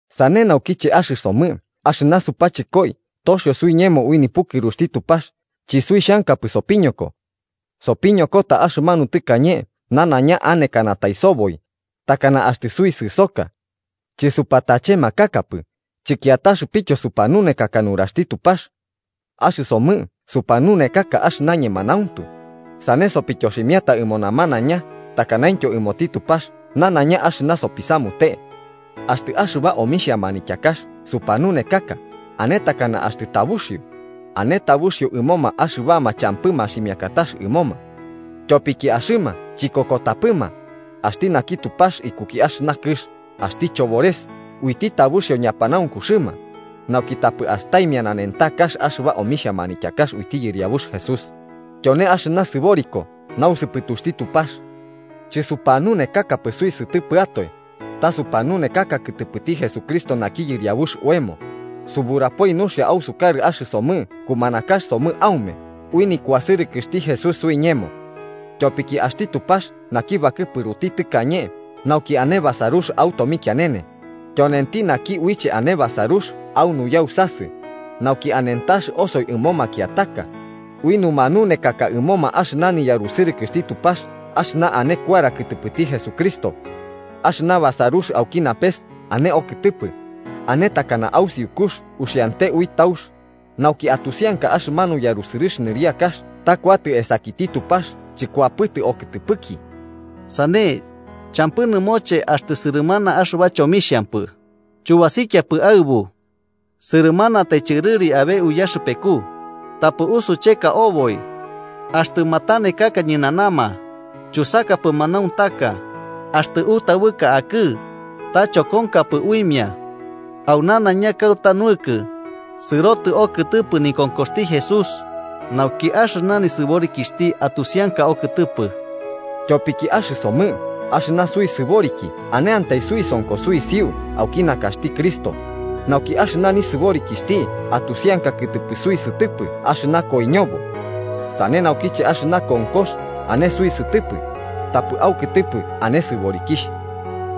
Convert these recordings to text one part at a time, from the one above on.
Sane naukiche axɨsomɨ axɨna supachɨkoi toxio suiñemo ui nipukɨruxti Tupax chisuixhankapɨ sopiñoko. Sopiñokota axɨmanu tɨkañe nanaiña anekanatai soboi, takana axtɨ suisɨsoka. Chɨsupatachemakakapɨ chɨkiataxɨpityo supanunekaka nuraxti Tupax. Axɨsomɨ supanunekaka axɨna ñemanauntu, sane sopityoximiata ɨmo namanaiña takanaintyo ɨmoti Tupax nanaiña axɨna sopisamute. Axtɨ axɨba omixhia manityakax supanunekaka ane takana axtɨ tabuxio, ane tabuxio ɨmoma axɨbama champɨ maximiakatax ɨmoma. Tyopiki axɨma chikokotapɨma, axti naki tupax ikuki axɨna kɨx (axti chobores) uiti tabuxio ñapanaunkuxɨma, nauki tapɨ astaimia nanentakax axɨba omixhia manityakax uiti Yɨriabux Jesús, tyone axɨna sɨboriko nausɨpɨtuxti Tupax. Chɨsupanunekakapɨ suisɨtɨpɨatoe, ta supanunekaka kɨtɨpɨti Jesucristo naki Yɨriabux oemo, suburapoi nuxia ausukarɨ axɨsomɨ kumanakax somɨ aume ui nikuasɨrɨkɨxti Jesús suiñemo. Tyopiki axti Tupax naki bakɨpuruti tɨkañe nauki ane basarux au tomikianene, tyonenti naki uiche ane basarux au nuyausasɨ, nauki anentax osoi ɨmo makiataka, ui numanunekaka ɨmoma axɨna niyarusɨrɨkɨxti Tupax axɨna ane kuara kɨtɨpɨti Jesucristo. Axɨna basarux auki napes ane okɨtɨpɨ, ane takana au siukux uxiante ui taux, nauki atusianka axɨmanu yarusɨrɨx nɨriakax ta kuatɨ esakiti Tupax chɨkuapɨtɨ okɨtɨpɨki. Sane, champɨ nɨmoche axtɨ sɨrɨmana axɨba chomixhampɨ, chubasiapɨ aɨbu. Sɨrɨmanatai chɨrɨri abe uyaxɨpeku, tapɨ usucheka oboi. Axtɨ matanekaka ñɨnanama, chusakapɨ manauntaka, axtɨ utaɨbɨka akɨ, ta chokonkapɨ uimia. Au nanaiña kauta nuɨkɨ, sɨrotɨ okɨtɨpɨ nikonkoxti Jesús, nauki axɨna nisɨborikixhti atusianaka okɨtɨpɨ. Tyopiki axɨsomɨ axɨna suisɨborikiaiki aneantai suisonko suisiu auki nakaxti Cristo, nauki axɨna nisɨborikixhti atusianka kɨtɨpɨ suisɨtɨpɨ axɨna koiñobo. Sane naukiche axɨna konkox ane suisɨtɨpɨ, tapɨ aukɨtɨpɨ ane sɨborikixh.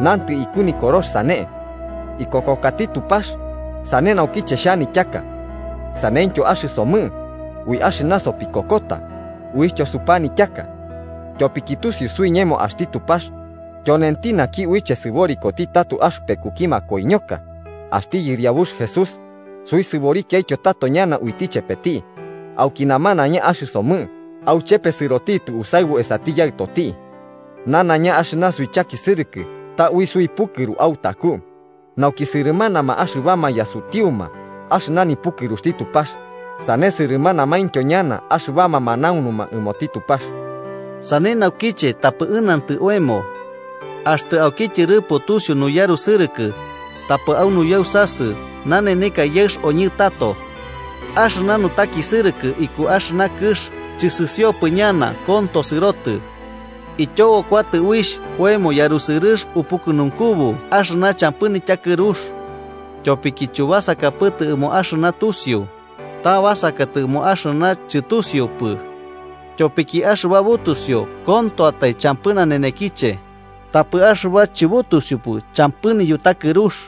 Nantɨ iku Nikorox sane: “Ikokokati Tupax, sane naukiche xhanityaka.” Saneityo axɨsomɨ, ui axɨna sopikokota, uixhtyo supanityaka. Tyopiki tusiu suiñemo axti Tupax, tyonenti naki uiche sɨborikoti tato axɨpekuki makoiñoka axti Yɨriabux Jesús, suisɨborikiaityo tato ñana uiti chepeti, auki namanaiña axɨsomɨ auchepe sɨrotitɨ usaɨbu esati Yaɨtoti. Nanaiña axɨna suichakisɨrɨkɨ ta ui suipukɨru autaku, nauki sɨrɨmanama axɨbama yasutiuma axɨna nipukɨruxti Tupax sane sɨrɨmanamaintyo ñana axɨbama manaunuma ɨmoti Tupax. Sane naukiche tapɨ ɨnantɨ oemo. Axtɨ auki tyɨrɨpo tusiu nuyarusɨrɨkɨ, tapɨ au nuyausasɨ naneneka yaɨx oñɨ tato. Axɨna nutakisɨrɨkɨ iku axɨna kɨx chɨsɨsiopɨ ñana, konto sɨrotɨ. Ityobo kuatɨ uixh oemo yarusɨrɨx upukɨnunkubu axɨna champɨ nityakɨrux. Tyopiki chubasakapɨtɨ ɨmo axɨna tusiu, ta basakatɨ ɨmo axɨna chɨtusiupɨ. Tyopiki axɨba butusiu kontoatae champɨ nanenekiche, tapɨ axɨba chɨbutusiupɨ champɨ niyutakɨrux.